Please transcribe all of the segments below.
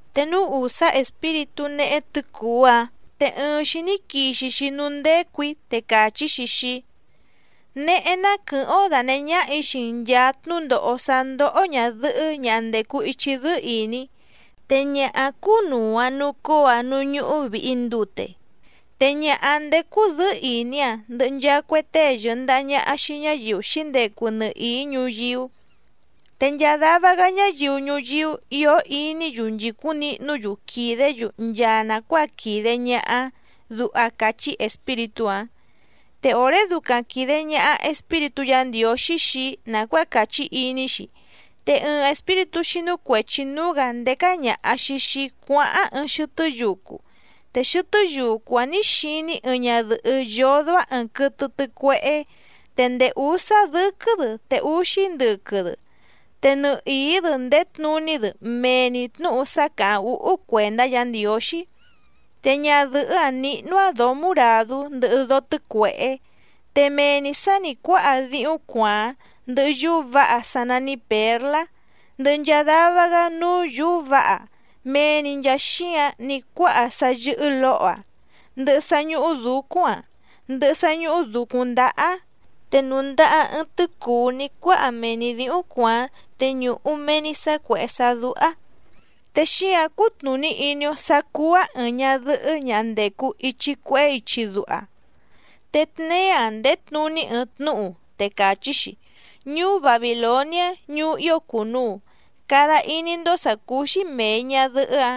Te núú ùsá espíritú néhé tɨ̌cùú‑áⁿ, te ɨɨⁿ‑xi ní quixi‑xi núú ndécù‑í, te càchí‑xi xii‑í: —Néhé ná quɨ̀hɨ́ⁿ‑ó dànehé ñáhà‑í xii‑n nchàa tnúndòho sá ndóhó ñàdɨhɨ́ ñaha ndècu ichi dɨ́ɨ́ ìní, te ñaha‑áⁿ cúnùu‑aⁿ nucóo‑aⁿ núú ñúhú vìhi ndute. Te ñaha‑áⁿ ndécú dɨ̌ɨ́ ìní‑aⁿ ndɨhɨ nchaa cue tée yɨ̀ndaha ñaha xii ñáyiu xǐndecu nɨhìí ñuyíú, te nchaa dava‑gá ñáyiu ñuyíú ìó iní‑yu nchìcúⁿ nihnú‑yu quìdé‑yu nchaa nàcuáa quìde ñaha‑áⁿ —duha càchí espíritú‑áⁿ. Te òré ducaⁿ quìde ñaha Espíritú Yǎ Ndiǒxí xii‑í nàcuáa càchí iní‑xi, te ɨɨⁿ espíritú xínú cuèchi núú‑gǎ ndécá ñàha‑xi xii‑í cuáháⁿ ɨɨⁿ xɨtɨ́ yucu, te xɨtɨ́ yucu‑áⁿ nǐ xiní‑í ɨɨⁿ ñadɨ̀hɨ́ yódó‑áⁿ ɨ̀ɨⁿ quɨtɨ tɨcuehé, te ndèé úsá dɨ́quɨ́‑dɨ te úxí ndɨquɨ‑dɨ, te nɨhìí‑dɨ ndèé tnuní‑dɨ mee‑ni tnǔhu sá càháⁿ úhú cuèndá Yǎ Ndiǒxí. Te ñadɨ̀hɨ́‑áⁿ níhnú‑áⁿ dǒó muràdú ndɨhɨ dóó tɨ́cuèhé, te mee‑ni sǎ nì cuáha díhúⁿ cuàáⁿ, ndɨhɨ yúú vǎha sá nání pěrlá, ndɨhɨ nchaa dava‑gá núú yǔú vǎha, mee‑ni nchàa xíǎⁿ ní cuáha sá yɨ́hɨ́ lǒho‑aⁿ, ndɨhɨ sá ñúhú dǔcúⁿ‑aⁿ, ndɨhɨ sá ñúhú dǔcúⁿ ndáhá‑áⁿ, te nùndaha‑aⁿ ɨɨⁿ tɨ́cùú ní cuáha mee‑ni dǐhúⁿ cuàáⁿ te ñùhu mee‑ni sá cuèhé sá dúhá, te xíǎⁿ cútnùní iní‑ó sǎ cúú‑áⁿ ɨ̀ɨⁿ ñadɨhɨ́ ñaha ndècu ichi cuehé ichi duha. Te tneé‑aⁿ ndèé tnuní ɨɨⁿ tnúhu, te càchí‑xi: “Ñuú Babìloniá ñuú ío cùnuu, cada iní‑ndó sà cúú‑xí mèi ñadɨhɨ́‑a,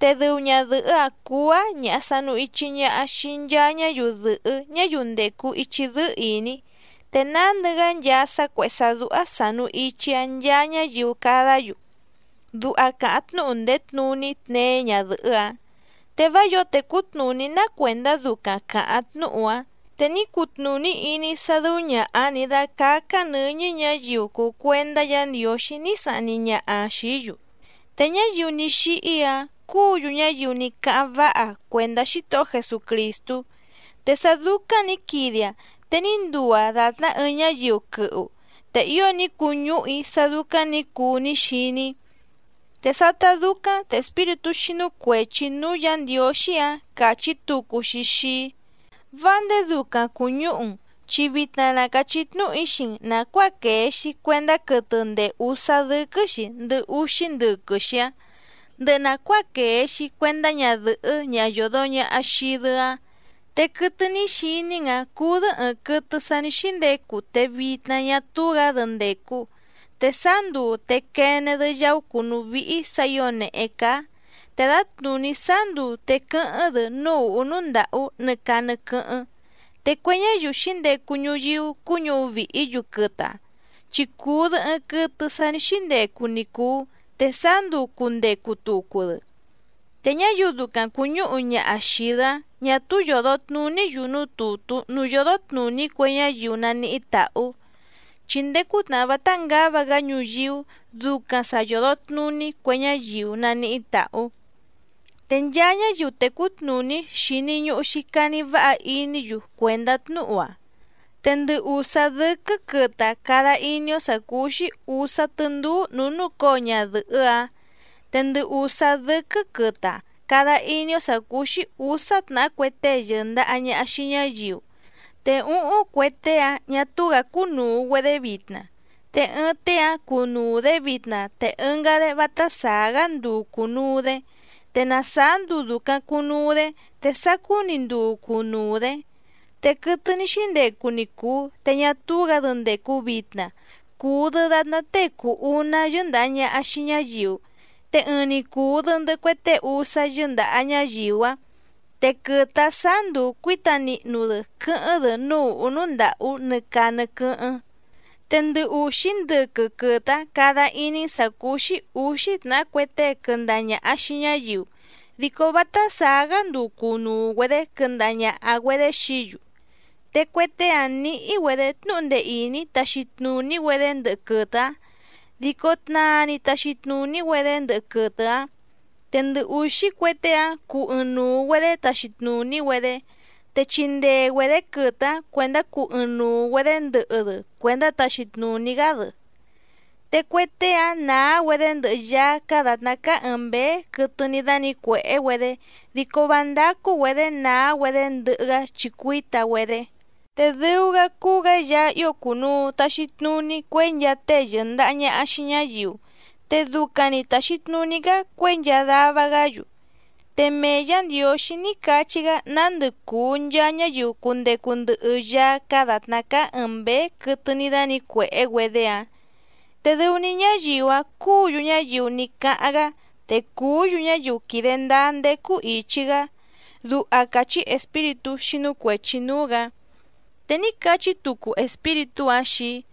te dɨu ñadɨ̀hɨ́‑a cùu‑aⁿ ñaha sanu ichi ñaha xii nchaa ñáyiu dɨ̀hɨ́ ñáyiu ndècu ichi dɨ́ɨ́ ìní, te nándɨ‑gá nchaa sá cuèhé sá dúhá sànu ichi‑aⁿ nchaa ñáyiu cadá‑yu”, duha càháⁿ tnúhu ndèé tnuní tneé ñadɨ̀hɨ́‑áⁿ. Te vá yǒo tècú tnùní ná cuèndá ducaⁿ càháⁿ tnúhu‑áⁿ. Te ní cutnùní iní‑í sá dɨ́ú ñàha‑áⁿ nǐ dácácá‑áⁿ nɨ̌ñɨ́ ñǎyiu cùu cuendá Yǎ Ndiǒxí ní sahni ñaha‑aⁿ xìí‑yu, te ñáyiu ní xíhí‑áⁿ cúǔ‑yu ñáyiu ní cáháⁿ váha cuèndá Xítohó Jesucrìstú, te sá dúcáⁿ nǐ quide‑aⁿ te ní nduu‑aⁿ dàtná ɨɨⁿ ñáyiu quɨhu. Te ío ní cuñúhu‑í sá dúcáⁿ nǐ cuu ní xiní‑í. Te sátá dúcáⁿ te espíritú xínú cuèchi núú Yǎ Ndiǒxí‑áⁿ càchí tucu‑xi xii‑í: —Vá ndèé dúcáⁿ cùñúhu‑n, chi vitna na càchí tnúhu‑í xii‑n nàcuáa quèe‑xi cuendá quɨtɨ ndèé úsá dɨ́quɨ́‑xi ndɨhɨ úxí ndɨquɨ‑xi‑áⁿ, ndɨhɨ nàcuáa quèe‑xi cuendá ñadɨ̀hɨ́ ñaha yòdo ñaha xii‑dɨ‑áⁿ. Te quɨtɨ ní xiní‑n‑ǎⁿ cúú‑dɨ́ ɨ̀ɨⁿ quɨtɨ sa ní xíndecu te vitna ñá túú‑gǎ‑dɨ ndècu, te sáá nduu te quene‑dɨ yaú cùnú víhí sǎ ǐo nèhé cáá, te dǎtnùní sáá nduu te quɨ́hɨ́ⁿ‑dɨ núú ùhú núú ndàhú nɨ caa nɨ quɨ́hɨ́ⁿ, te cue ñáyiu xǐndecu ñuyíú cuñúhu vìhí‑yu quɨtɨ‑áⁿ chi cùu‑dɨ ɨɨⁿ quɨtɨ sa ní xíndecu ni cùu te sáá nduu cùndecu tucu‑dɨ, te ñáyiu ducaⁿ cùñúhu ñaha xìi‑dɨ‑áⁿ ñà túú yòdo tnuní‑yu núú tùtú núú yódó tnùní cue ñáyiu naníhí tàhú, chi ndéé cútnàhá vátá ngǎva‑gá ñuyíú ducaⁿ sa yòdo tnuní cue ñáyiu naníhí tàhú. ’Te nchaa ñáyiu tècú tnùní xìni ñuhu‑xi cani váha iní‑yu cuèndá tnúhu‑a. Te ndɨ ùsá dɨ́quɨ́ quɨtɨ‑áⁿ cada iní‑ó sǎ cúú‑xí ǔsá tɨ́ndúú nǔú núcǒo ñadɨ̀hɨ́‑áⁿ. Te ndɨ ùsá dɨ́quɨ́ quɨtɨ‑áⁿ cada iní‑ó sǎ cúú‑xí ǔsá tnàhá cue tée yɨ̀ndaha ñaha xii ñáyiu, te úhúⁿ cue tée‑áⁿ ñà túú‑gǎ cúnùu‑güedé vitna, te ɨɨⁿ tée‑áⁿ cúnùu‑dé vitna te ɨngá‑dé vátá sàá‑gá nduu cùnuu‑dé, te na sàá nduu dùcaⁿ cunuu‑dé te sacú‑ni nduu cunuu‑dě. Te quɨtɨ ní xíndecu ni cùu te ñá túú‑gǎ‑dɨ ndècu vitna, cùu‑dɨ datná tée cùu uná yɨ́ndàha ñaha xii ñáyiu, te ɨɨⁿ‑ni cùu‑dɨ ndɨhɨ cue tée úsá yɨ́ndàha ñáyiu‑áⁿ, te quɨtɨ‑áⁿ sǎá nduu cuíta nihnu‑dɨ quɨ́hɨ́ⁿ‑dɨ núú ùhú núú ndàhú nɨ caa nɨ quɨ́hɨ́ⁿ. ’Te ndɨ ùxí ndɨquɨ quɨtɨ‑áⁿ cada iní‑n sǎ cúú‑xí ǔxí tnàhá cue tée quɨndaha ñàha xii ñáyiu, dico vátá sàá‑gá nduu cùnuu‑güedé quɨndaha ñàha‑güedé xií‑yu. Te cue tée‑áⁿ nǐhí‑güedě tnúhu ndee ìní taxi tnùní‑güedé ndɨhɨ quɨtɨ‑áⁿ, dico tnaa‑ni taxi tnùní‑güedé ndɨhɨ quɨtɨ‑áⁿ. Te ndɨ ùxí cue tée‑áⁿ cuu ɨɨⁿnuu‑güedě taxi tnùní‑güedé, te chindee‑güedě quɨtɨ‑áⁿ cuèndá cuu ɨɨⁿnuu‑güedě ndɨhɨ‑dɨ cuèndá taxi tnùní‑gá‑dɨ. Te cue tée‑áⁿ nàá‑güedé ndɨhɨ Yaá cáá dàtná cáá ɨ̀ɨⁿ mbéé quɨtɨ ní dánǐcuèhé‑güedé dico vá ndácú‑güedě nàá‑güedé ndɨhɨ‑gá chi cuíta‑güedé. Te dɨu‑gá cúú‑gǎ Yaá ío cùnuu taxi tnuní cuěi nchaa tée yɨ̀ndaha ñaha xii ñáyiu, te ducaⁿ‑ni tàxi tnuní‑gá cuěi nchaa dava‑gá‑yu. Te mee Yǎ Ndiǒxí ní cachí‑gá nándɨ cùu nchaa ñáyiu cundecu ndɨhɨ Yaá cáá dàtná cáá ɨ̀ɨⁿ mbéé quɨtɨ ní dánǐcuèhé‑güedé‑áⁿ, te dɨu‑ni ñáyiu‑áⁿ cúǔ‑yu ñáyiu ní cáháⁿ‑gá te cùú‑yu ñáyiu quìde ndáá ndécú ìchi‑gá —duha càchí espíritú xínú cuèchi núú‑gǎ. Te ní cachí tucu espíritú‑áⁿ xii‑í: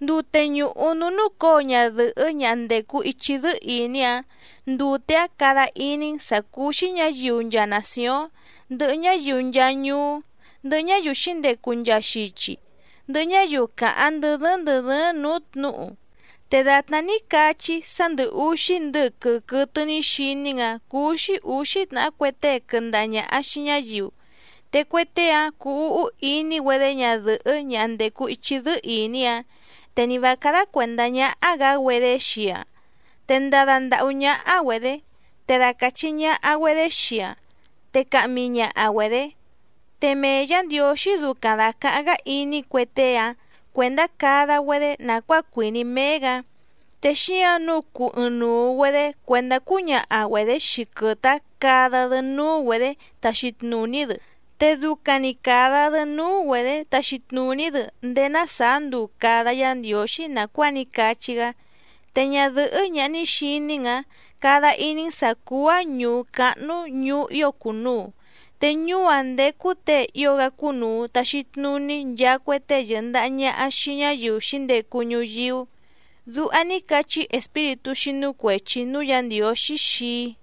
—Ndute ñùhu núú núcǒo ñadɨ̀hɨ́ ñaha ndècu ichi dɨ́ɨ́ ìní‑áⁿ, ndute‑áⁿ cada iní‑n sǎ cúú‑xí ñǎyiu nchaa nàcióⁿ, ndɨhɨ ñáyiu nchaa ñuú, ndɨhɨ ñáyiu xǐndecu nchaa xichi, ndɨhɨ ñáyiu càháⁿ ndɨ́ dɨ́ɨ́ⁿ ndɨ̀ dɨ́ɨ́ⁿ nǔú tnǔhu. Te dàtná ní cachí‑í sá ndɨ̀ uxí ndɨquɨ quɨtɨ ní xiní‑n‑ǎⁿ cúú‑xí ǔxí tnàhá cue tée quɨndaha ñàha xii ñáyiu, te cue tée‑áⁿ cuu úhú iní‑güedé ñadɨ̀hɨ́ ñaha ndècu ichi dɨ́ɨ́ ìní‑áⁿ, te ni vǎ cádá cuèndá ñáhá‑gǎ‑güedé xii‑aⁿ, te ndada ndàhú ñáhá‑güedě, te dacàchi ñaha‑güedé xii‑aⁿ, te cahmi ñaha‑güedě. Te mee Yǎ Ndiǒxí ducaⁿ dàcaháⁿ‑gá iní cue tée‑áⁿ cuèndá cada‑güedé nàcuáa cuìní méé‑gǎ, te xíǎⁿ nǔu cuu ɨɨⁿnuu‑güedě cuèndá cúñaha‑güedě xii quɨtɨ‑áⁿ cada‑dɨ núú‑güedě taxi tnùní‑dɨ, te ducaⁿ‑ni càda‑dɨ núú‑güedě taxi tnùní‑dɨ ndéé ná sàá nduu càda Yá Ndiǒxí nàcuáa ní cachí‑gá. Te ñadɨ̀hɨ́ ñaha ní xiní‑n‑ǎⁿ cada iní‑n sǎ cúú‑áⁿ ñùú cáhnú ñùú ío cùnuu, te ñuú‑áⁿ ndécú těe ío‑gá cúnùu taxi tnuní nchaa cue tée yɨ̀ndaha ñaha xii ñáyiu xǐndecu ñuyíú —duha ní cachí espíritú xínú cuèchi núú Yǎ Ndiǒxí xii‑í.